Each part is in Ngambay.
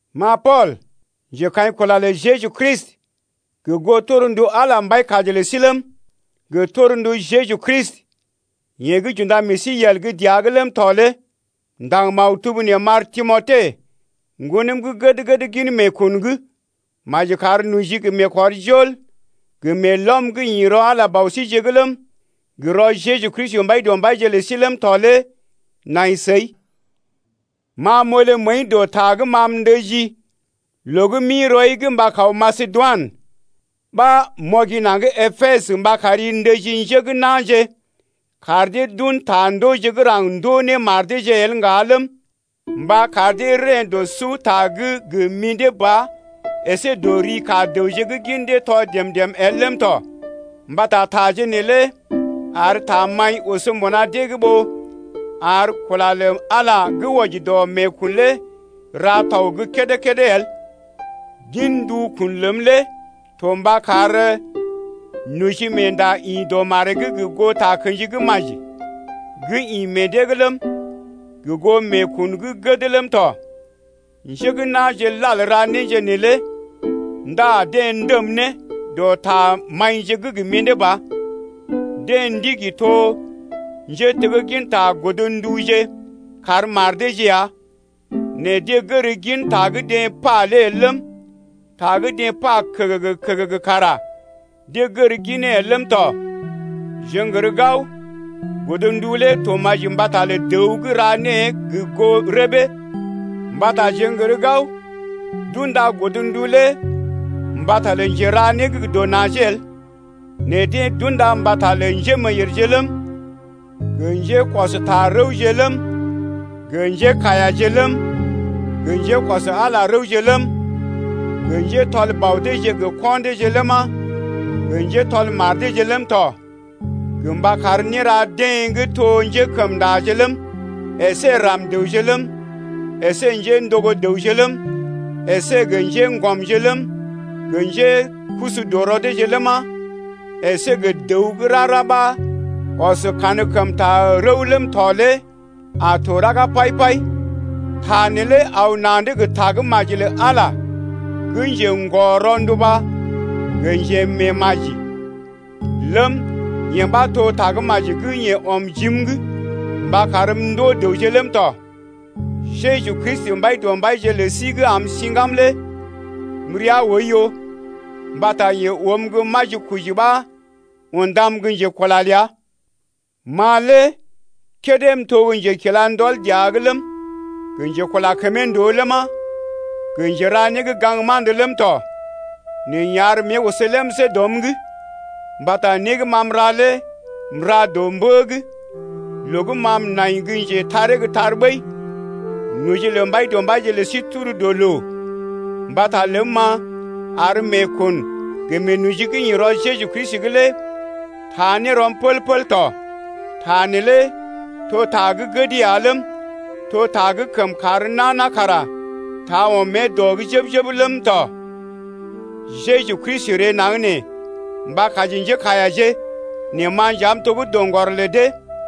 Ma Pool, njekaḭkula lə Jeju Kristi gə goo torndu Ala Mbaikaji lə sí ləm, gə torndu Jeju Kristi, yeḛ gə́ j’unda meḛ sí yel gə́ dəa’g ləm tɔ lé m’ndaŋg maktub nee m’ar Timote, ŋgonəm gə́ gəd-gəd gin meekun’g. Maji kar noji, gə meekɔrjol, gə meelɔm gə́ ḭ rɔ Ala Bɔ síje’g ləm, gə rɔ Jeju Kristi Mbaidɔmbaije’g lə sí ləm tɔ lé nai səi. Ma m’olé məəi dɔ ta gə́ ma m’ndəjii loo gə́ m’ḭ rɔi’g mba kaw Masedoinə ɓa m’ɔgi naŋg Epesə mba kari ndəji njé gə́ na̰je kar dee d’un ta ndooje gə́ raŋg ndoo ne mar deeje el ŋga ləm, mba kar dee reḛ́ dɔ suta’g gə mḭdé ba əsé dɔ ri ka dəwje gə́ gin dee tɔ dèm-dèm el ləm tɔ, mbata taje neelé ar tamaḭ oso mbuna dee’g ɓó ar kula lə Ala gə́ wɔji dɔ meekun lé ra tɔg gə́ kédé-kédé el. Gin ndukun ləm lé to mba kar nojimeenda ḭ dɔ maree’g gə goo takə̰ji gə́ maji gə́ ḭ meḛ dee’g ləm, gə goo meekun gə́ gəd ləm tɔ. Njé gə́ na̰je lal ra néje neelé ndá deḛ ndəm ne dɔ tamaḭje gə́ gə mḭdé ba. Deḛ ndigi to njétegginta godnduje kar mar deeje ya nɛ deḛ gər gin ta gə́ deḛ pa lé el ləm, ta gə́ deḛ pa kəgəgə-kəgəgə kara deḛ gər ginee el ləm tɔ. Jeḛ n’gər gao, godndu lé to maji mbata lə dəw gə́ ra née gə goo rəbee. Mbata jeḛ n’gər gao d’unda godndu lé mbata lə njera né gə́ gə dɔ najee el nɛ deḛ d’unda mbata lə njémeeyèrje ləm, gə njékɔsta-rəwje ləm, gə njékaiyaje ləm, gə njékɔs Ala rəwje ləm, gə njétɔl bɔ deeje gə ko̰ deeje ləma, gə njétɔl mar deeje ləm tɔ, gə mba kar néra dee gə́ to njékəmndaje ləm, əsé ram-dəwje ləm, əsé njéndogo dəwje ləm, əsé gə njéŋgɔmje ləm, gə njékusu dɔ rɔ deeje ləma, əsé gə dəw gə́ rara ɓa ɔs kankəmta rəw ləm tɔ lé a to raga pai-pai ya. Ta neelé aw na̰’d gə Tagə́maji lə Ala gə́ njḛgɔ-ronduba gə njemeemaji ləm, yee ɓa to Tagə́maji gə́ yeḛ ɔm jim’g mba karm m’ndoo dəwje ləm tɔ. Jeju Kristi, Mbaidɔmbaije lə sí gə́ am siŋgam lé m’rəa oiyo mbata yeḛ oom gə́ majikoji ɓa undam gə́ njekula ləa. Ma lé kédé m’to gə́ njekila ndɔl dəa’g ləm, gə njekula kəmee ndòo ləma, gə njera né gə́ ga̰gma̰d ləm tɔ. Nɛ yeḛ ar mée oso lemsé dɔm’g mbata né gə́ ma m’ra lé m’ra dɔ mbə’g loo gə́ ma m’nai gə́ njetaree gə́ tar ɓəi. Noji lə Mbaidɔmbaije lə sí tur dɔ loo mbata ləm-ma ar meekun gə meenoji gə́ ḭ rɔ Jeju Kristi’g lé taa ne rɔm pəl-pəl tɔ. Ta neelé to ta gə́ gəd ya ləm, to ta gə́ kəm kar nana kara taa ɔm mée dɔ’g jəb-jəb ləm tɔ: Jeju Kristi ree naŋg nee mba kaji njékaiyaje, nɛ ma nja m’to gə́ doŋgɔr lə dee.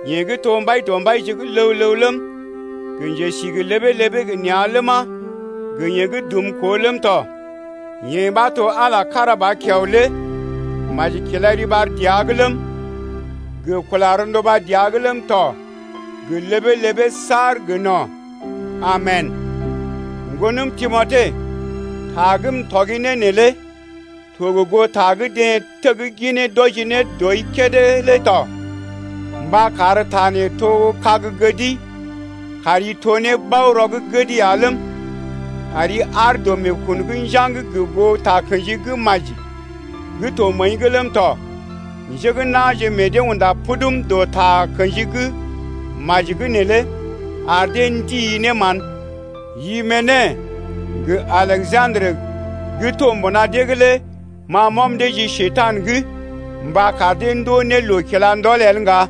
Yeḛ gə́ to Mbaidɔmbaije gə́ ləw-ləw ləm, gə njesi gə ləbee-ləbee gə nea̰ ləma, gə yeḛ gə́ dumkoo ləm tɔ, yeḛ ɓa to Ala kára ba kiao lé, maji kila riɓar dəa’g ləm, gə kula rɔnduba dəa’g ləm tɔ gə ləbee-ləbee saar gə no̰. Amen! Ŋgonəm Timote, ta gə́ m’tɔgi ne neelé to gə́ goo ta gə́ deḛ tegginee d’wɔji ne dɔi kédé lé to mba kar ta nee to kag gədi kari to ne bao-rɔ gə́ gəd ya ləm, kari aar dɔ meekun’g njaŋg gə goo takə̰ji gə́ maji gə́ to məəi’g ləm tɔ. Njé gə́ na̰je meḛ dee unda pudum dɔ takə̰ji gə́ maji’g neelé ar meekun lə dee ndii ne mán. Imene gə Aleja̰drə gə́ to mbuna dee’g lé ma m’ɔm dee ji Njekurai’g gə mba kar dee ndoo ne loo kila ndɔl el ŋga.